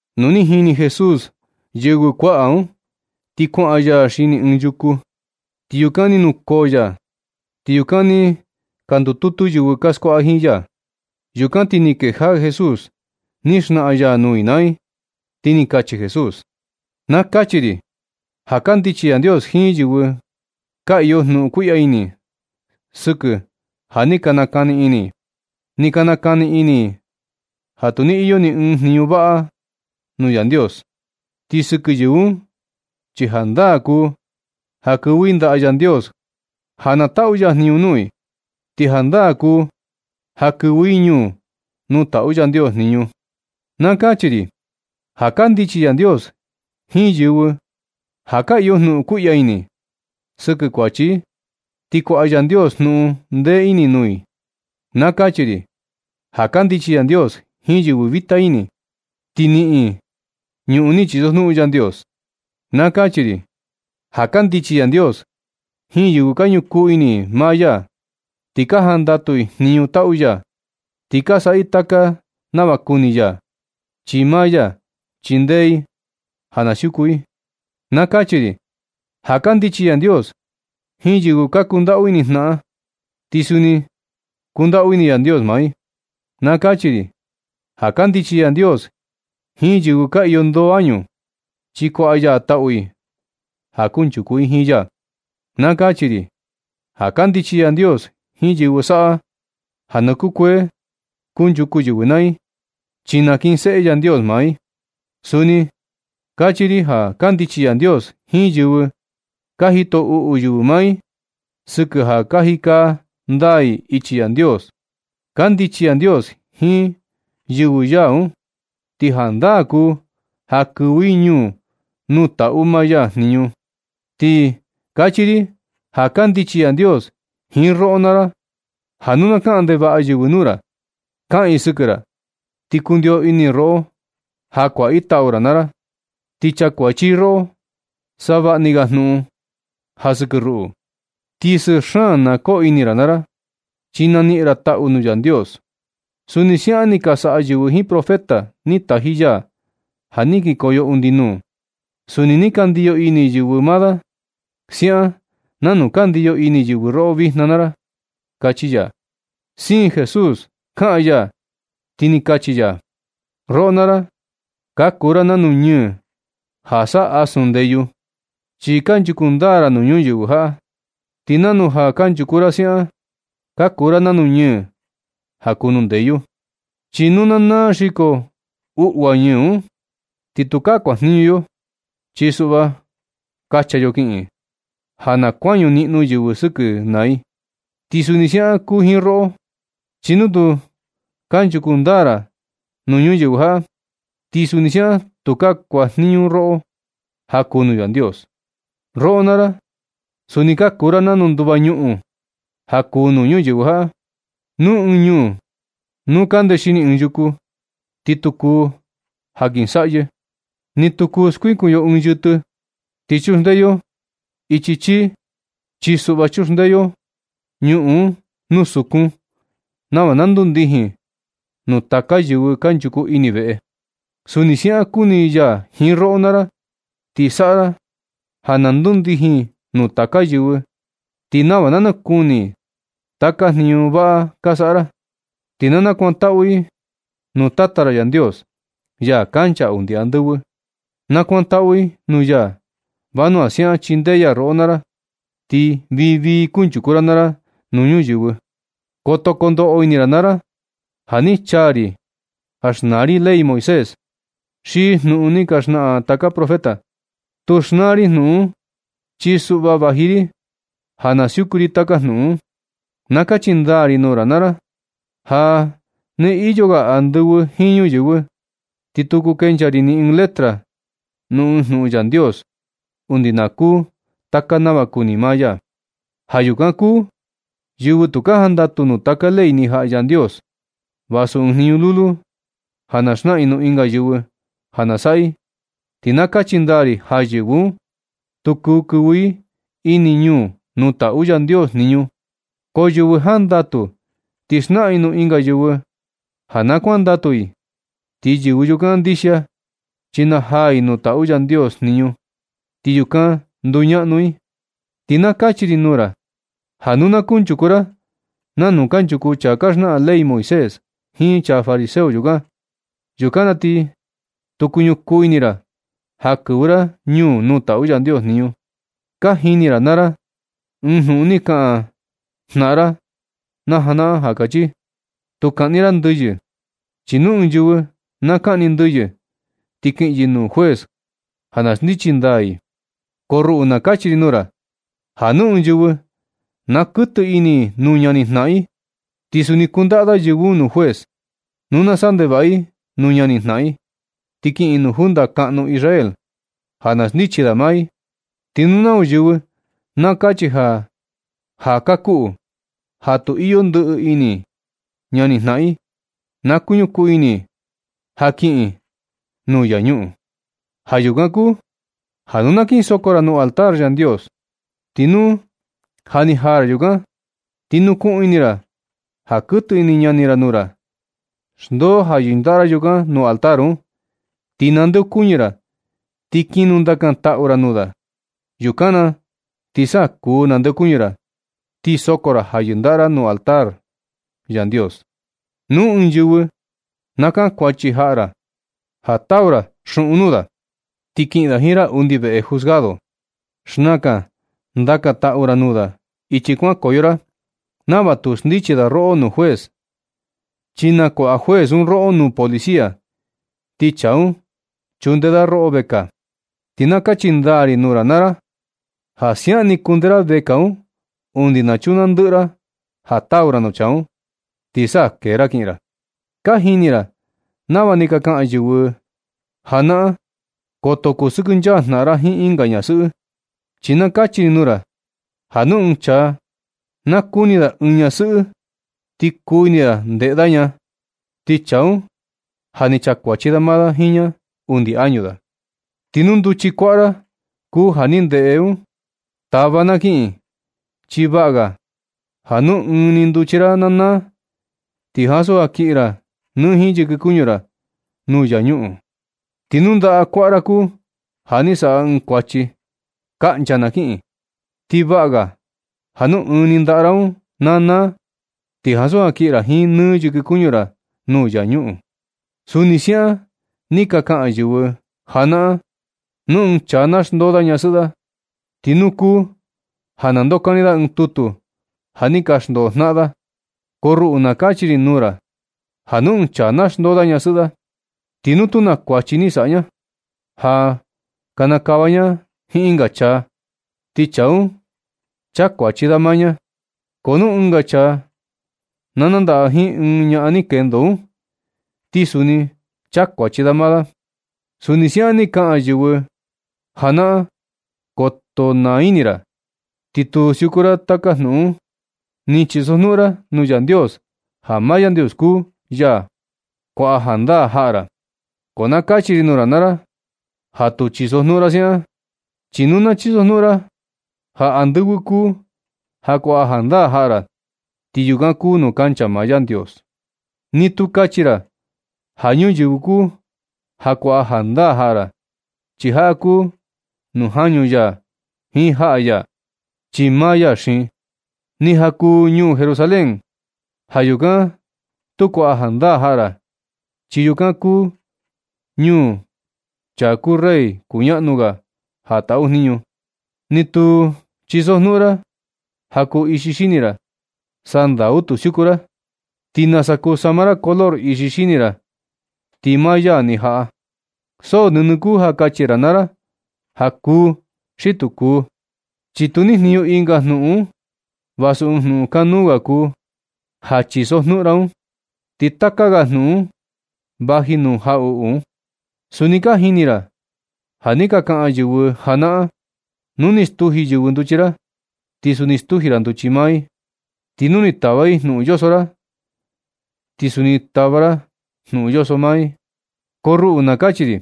Nu ni jini Jesús yɨvɨ kuaꞌa un, ti kuaꞌan ya xini ɨɨn yuku, ti yukan ni nukoo ya. Ti yukan ni ka ndututu yɨvɨ ka skuaꞌa jiin ya. Yukan ti ni kejaꞌa Jesús ni xnaꞌan ya nuu i naa i. Ti ni kachi Jesús: ―Na kachi ri ja kandichi Yandios jiin yɨvɨ ka iyo jnuꞌun kuiꞌya ini sɨkɨ ja ni ka nakani ini i. Ni ka nakani ini i ja tu ni iyo ni ɨɨn jniñu vaꞌa i nuu Yandios. Ti sɨkɨ yɨvɨ un chi jandaa kuu ja kɨvɨ i ndaꞌa Yandios ja na taꞌu ya jniñu nuu i. Ti jandaa kuu ja kɨvɨ i ñuu nuu taꞌu Yandios jniñu. Kachi ri ja kandichi Yandios jiin yɨvɨ ja ka iyo jnuꞌun kuiꞌya ini sɨkɨ kuachi i, ti kuaꞌa Yandios jnuꞌun ndee ini nuu i. Kachi ri ja kandichi Yandios jiin yɨvɨ vita ini, ti niꞌin i ñuꞌun ni chisojnuꞌun Yandios. Kachi ri ja kandichi Yandios jiin yɨvɨ ka ñukuu ini maa ya ti ka jandatu i jniñu taꞌu ya, ti ka saꞌa i taka nava kuni ya, chi maa ya chindee i ja na siuku i. Kachi ri ja kandichi Yandios jiin yɨvɨ ka kundaꞌu ini jnaꞌan, ti suni kundaꞌu ini Yandios maa i. Kachi ri ja kandichi Yandios jiin yɨvɨ ka iyo ndoo añu, ti kuaꞌa ya taꞌu i ja kunchuku i jiin ya. Kachi ri ja kandichi Yandios jiin yɨvɨ saꞌa ja na kukuee kunchuku yɨvɨ naa i, chi nakinseꞌe Yandios maa i. Suni kachi ri ja kandichi Yandios jiin yɨvɨ ka jito uꞌu yɨvɨ maa i sɨkɨ ja ka jika ndaa i ichi Yandios. Kandichi Yandios jiin yɨvɨ ya un, ti jandaa kuu ja kɨvɨ i ñuu nuu taꞌu maa ya jniñu. Ti kachi ri ja kandichi Yandios jiin roꞌo naa ra ja nu na kaꞌan ndevaꞌa yɨvɨ nuu ra, kaꞌan i sɨkɨ ra ti kundio ini i roꞌo ja kuaꞌa i tau ra naa ra, ti chakuachi i roꞌo savaꞌa ni ga jnuꞌun ja sɨkɨ ruꞌu. Ti sɨɨ xaan na koo ini ra naa ra, chi na niꞌin ra taꞌu nuu Yandios. Suni siaꞌan ni ka saꞌa yɨvɨ jiin profeta ni taji ya ja ni kikoyo undi nuu. Suni ni ka ndiyo ini yɨvɨ maa da, siaꞌan nanu ka ndiyo ini yɨvɨ roꞌo vijna naa ra ―kachi ya. Siin Jesús kaꞌan ya, ti ni kachi ya: ―Roꞌo naa ra, ka kuu ra nanu ñɨɨ ja saꞌa asun ndeyu, chi kanchuku ndaa ra nuu ñuyɨvɨ jaꞌa. Ti nanu ja kanchuku ra siaꞌan, ka kuu ra nanu ñɨɨ ja kuu nuu ndeyu. Chi nu na naa xiko uꞌua ñɨɨ un, ti tukaa kuajniñu yo, chi suꞌva kacha yo kiꞌin, ja na kuañu niꞌnu yɨvɨ sɨkɨ naa i. Ti suni siaꞌan kuu jiin roꞌo, chi nu tu kanchuku ndaa ra nuu yɨvɨ ñuyɨvɨ jaꞌa, ti suni siaꞌan tukaa kuajniñu roꞌo ja kuu nuu Yandios. Roꞌo naa ra, suni ka kuu ra nanu nduva ñuꞌun ja kuu nuu ñuyɨvɨ jaꞌa. Nu ɨɨn ñuu na kundee xini ɨɨn yuku, ti tu kuu jankɨsaꞌyɨ. Ni tu kuu skuikun yo ɨɨn yɨtɨ, ti chunde yo chii ɨɨn cajón. Chi suꞌva chuxndee yo ñuꞌun un nuu sukun nava na kundijin nuu taka yɨvɨ kanchuku ini veꞌe. Suni siaꞌan kuni ya jiin roꞌo naa ra, ti saꞌa ra ja na ndundijin nuu taka yɨvɨ, ti nava na nakuni i taka jniñu vaꞌa ka saꞌa ra. Ti na nakuantaꞌu i nuu Tata ra Yandios, ya kancha undi andɨvɨ. Nakuantaꞌu i nuu ya vanua siaꞌan chindee ya roꞌo naa ra, ti vii vii kunchuku ra naa ra nuu ñuyɨvɨ. Koto kondoꞌo ini ra naa ra ja ni chaa ri xnaa ri ley Moisés, xi jnuꞌun ni ka xnaꞌan taka profeta. Tu xnaa ri jnuꞌun un, chi suꞌva vaji ri ja na siuku ri taka jnuꞌun un. Na kachi ndaa ri nuu ra naa ra ja nɨ iyo ga andɨvɨ jiin ñuyɨvɨ, ni tu kuu kencha ri ni ɨɨn letra nuu ɨɨn jnuꞌun Yandios, undi na kuu taka nava kuni maa ya. Ja yukan kuu yɨvɨ tu ka jandatu nuu taka ley ni jaꞌa Yandios, vasu ɨɨn jniñu lulu, ja na xnaꞌan i nuu ɨnga yɨvɨ ja na saꞌa i, ti na kachi ndaa ri ja yɨvɨ un, tu kuu kɨvɨ i ini ñuu nuu taꞌu Yandios jniñu. Ko yɨvɨ jandatu ti xnaꞌan i nuu ɨnga yɨvɨ ja na kuandatu i, ti yɨvɨ yukan ndixia chi najaa i nuu taꞌu Yandios jniñu ti yukan nduñaꞌnu i. Ti na kachi ri nuu ra ja nu na kunchuku ra nanu kanchuku chaa ka xnaꞌan ley Moisés jiin chaa fariseo yukan, yukan na ti tu kuñukun ini ra ja kɨvɨ ra ñuu nuu taꞌu Yandios jniñu. Ka jini ra naa ra ɨɨn jnuꞌun ni ka kaꞌan jnaꞌan ra na janaꞌan ja kachi: “Tu kaꞌni ra ndɨyɨ, chi nu ɨɨn yɨvɨ na kaꞌni ndɨyɨ ti kiꞌin yɨ nuu juez ja na xndichi da i.” Ko ruꞌu na kachi ri nuu ra ja nu ɨɨn yɨvɨ na kɨtɨ ini i nuu ñani jnaꞌan i, ti suni kundaꞌa da yɨvɨ un nuu juez. Nu na saꞌa ndevaꞌa i nuu ñani jnaꞌan i, ti kiꞌin i nuu junta kaꞌnu Israel ja na xndichi da maa i. Ti nuu nau yɨvɨ na kachi ja kakuꞌu xi ja tu iyo ndɨꞌɨ ini ñani jnaꞌan i, na kuñukuu ini i ja kiꞌin i nuu infiernu. Ja yukan kuu ja nu na kin soko ra nuu altar Yandios, ti nu ja ni jaa ra yukan, ti nukuꞌun ini ra ja kɨtɨ ini ñani ra nuu ra, xndoo ja yɨndaꞌa ra yukan nuu altar un, ti nandeokuñɨ ra, ti kin nundaka taꞌu ra nuu da. Yukan na ti sa kuu nandeokuñɨ ra, ti soko ra ja yɨndaꞌa ra nuu altar Yandios. Nu ɨɨn yɨvɨ na kankuachi jaꞌa ra ja tau ra xuꞌun nuu da, ti kiꞌin da jiin ra undi veꞌe juzgado. Xnakan ndaka taꞌu ra nuu da ichi kuankoyo ra nava tu xndichi da roꞌo nuu juez, chi nakuaꞌa juez un roꞌo nuu policia, ti chaa un chunde da roꞌo vekaa. Ti na kachi ndaa ri nuu ra naa ra, ja siaꞌan ni kundee ra vekaa un undi na chunaa ndɨꞌɨ ra ja tau ra nuu chaa un, ti sa kee ra kiꞌin ra. Ka jini ra nava ni ka kaꞌan yɨvɨ janaꞌan: “Koto kusɨkɨnchaa jnaꞌan ra jiin ɨnga ñasɨꞌɨ.” Chi na kachi ri nuu ra ja nu ɨɨn chaa na kuni da ɨɨn ñasɨꞌɨ ti kuu ini da ndeꞌe da ña, ti chaa un ja ni chakuachi da maa da jiin ña undi añu da. Ti nu nduchi kuaꞌa ra kuu ja ni ndeꞌe un, tava na kiꞌin. Chi vaꞌa ga ja nu ɨɨn ni nduchi ra na naa, ti ansu ja kiꞌin ra nɨ jiin yɨkɨ kuñu ra nuu infiernu. Ti nu ndaꞌa kuaꞌa ra kuu ja ni saꞌa ɨɨn kuachi, kaꞌncha na kiꞌin, chi vaꞌa ga ja nu ɨɨn ni ndaꞌa ra un na naa, ti ansu ja kiꞌin ra nɨ jiin yɨkɨ kuñu ra nuu infiernu. Suni siaꞌan ni ka kaꞌan yɨvɨ janaꞌan: “Nu ɨɨn chaa na xndoo da ñasɨꞌɨ da, ti nuu kuu ja na ndokani da ɨɨn tutu ja ni ka xndoo jnaꞌan da.” Ko ruꞌu na kachi ri nuu ra ja nu ɨɨn chaa na xndoo da ñasɨꞌɨ da, ti nu tu naa kuachi ni saꞌa ña, ja kinikava ña jiin ɨnga chaa, ti chaa un chakuachi da maa ña. Ko nu ɨnga chaa na nandaꞌa jiin ɨɨn ñaꞌan ni kendo un, ti suni chakuachi da maa da. Suni siaꞌan ni ka kaꞌan yɨvɨ janaꞌan: “Koto naa ini ra, ti tu siuku ra taka jnuꞌun ni chisojnuꞌun ra nuu Yandios, ja maa Yandios kuu ya kuaꞌa jandaa jaꞌa ra.” Ko na kachi ri nuu ra naa ra ja tu chisojnuꞌun ra siaꞌan, chi nu na chisojnuꞌun ra ja andɨvɨ kuu ja kuaꞌa jandaa jaꞌa ra, ti yukan kuu nuu kancha maa Yandios. Ni tu kachi ra ja ñuyɨvɨ kuu ja kuaꞌa jandaa jaꞌa ra, chi jaꞌa kuu nuu jañu ya jiin jaꞌa ya, chi maa ya xiin. Ni ja kuu ñuu Jerusalén, ja yukan tu kuaꞌa jandaa jaꞌa ra, chi yukan kuu ñuu chaa kuu Rey kuñaꞌnu ga ja taꞌu jniñu. Ni tu chisojnuꞌun ra ja kuu ixi xini ra. Sandau tu siuku ra, ti nasa kuu sama ra color ixi xini ra ti maa ya ni jaꞌa. So nɨnɨ kuu ja kachi ra naa ra ja “kuu” xi “tu kuu”, chi tu nijniñu ɨnga jnuꞌun un, vasu ɨɨn jnuꞌun kanuu ga kuu ja chisojnuꞌun ra un, chi taka ga jnuꞌun un vaji nuu jaꞌuꞌu un. Suni ka jini ra ja ni ka kaꞌan yɨvɨ janaꞌan: “Nu ni stuji yɨvɨ nduchi ra, ti suni stuji nduchi maa i. Ti nu ni tava i jnuꞌun yoso ra, ti suni tava ra jnuꞌun yoso maa i.” Ko ruꞌu na kachi ri: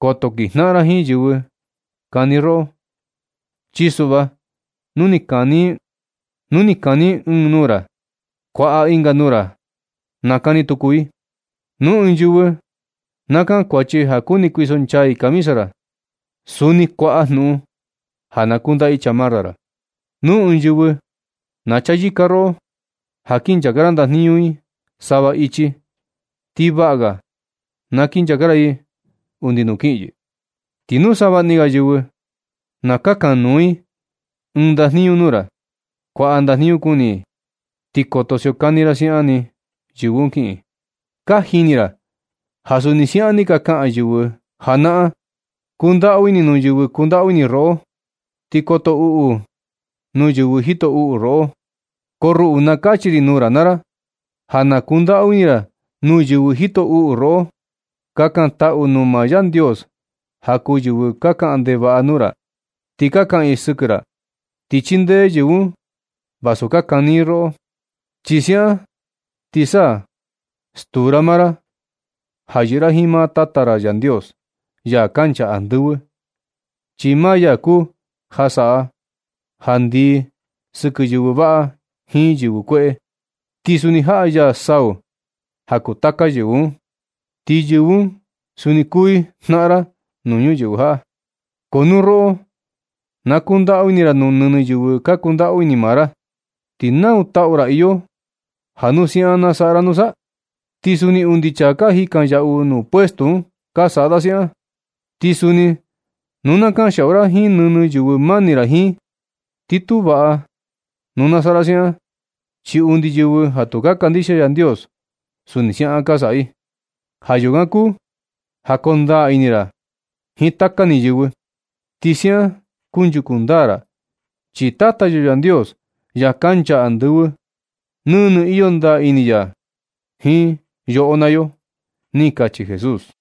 Koto kinjnaꞌan ra jiin yɨvɨ kani roꞌo, chi suꞌva nu ni kani i ɨɨn nuu nuu ra, kuaꞌa ɨnga nuu ra na kani tuku i. Nu ɨɨn yɨvɨ na kankuachi ja kuni kuisonchaa i camisa ra, suni kuaꞌa jnuꞌun ja na kundaꞌa i chamarra ra. Nu ɨɨn yɨvɨ na chayɨka roꞌo ja kin nchaka ra ndajniñu i sava ichi, ti vaꞌa ga na kinchaka ra i undi nuu kiꞌin yɨ. Ti nu savaꞌa ni ga yɨvɨ na kakan nuu i ɨɨn ndajniñu nuu ra, kuaꞌa ndajniñu kuni i, ti koto siokani ra siaꞌan ni yɨvɨ un kiꞌin. Ka jini ra ja suni siaꞌan ni ka kaꞌan yɨvɨ janaꞌan: “Kundaꞌu ini nuu yɨvɨ kundaꞌu ini roꞌo, ti koto uꞌu nuu yɨvɨ jito uꞌu roꞌo.” Ko ruꞌu na kachi ri nuu ra naa ra ja na kundaꞌu ini ra nuu yɨvɨ jito uꞌu roꞌo. Kakantaꞌu nuu maa Yandios ja kuu yɨvɨ ka kaꞌan ndevaꞌa nuu ra ti ka kaꞌan i sɨkɨ ra, ti chindee yɨvɨ un vasu na kani i roꞌo. Chi siaꞌan ti sa stuu ra maa ra ja yɨꞌɨ ra jiin maa Tata ra Yandios, ya kancha andɨvɨ. Chi maa ya kuu ja saꞌa ja ndii sɨkɨ yɨvɨ vaꞌa jiin yɨvɨ kueꞌe, ti suni jaꞌa ya sau ja kuu taka yɨvɨ un, ti yɨvɨ un suni kuu i jnaꞌan ra nuu ñuyɨvɨ jaꞌa. Ko nu roꞌo na kundaꞌu ini ra nuu nɨnɨ yɨvɨ ka kundaꞌu ini maa ra, ¿ti nau taꞌu ra iyo ja nu siaꞌan naa saꞌa ra nusa? Ti suni undi chaa ka jikan yaꞌu nuu puestu un ka saꞌa da siaꞌan. Ti suni nu na kanxiaꞌu ra jiin nɨnɨ yɨvɨ mani ra jiin, ti tu vaꞌa nu na saꞌa ra siaꞌan, chi undi yɨvɨ ja tu ka kandixia Yandios, suni siaꞌan ka saꞌa i. Ja yukan kuu ja koo ndaa ini ra jiin taka ni yɨvɨ. Ti siaꞌan kunchuku ndaa ra, chi Tata yo Yandios, ya kancha andɨvɨ, nɨnɨ iyo ndaa ini ya jiin yoꞌo naa yo ―ni kachi Jesús.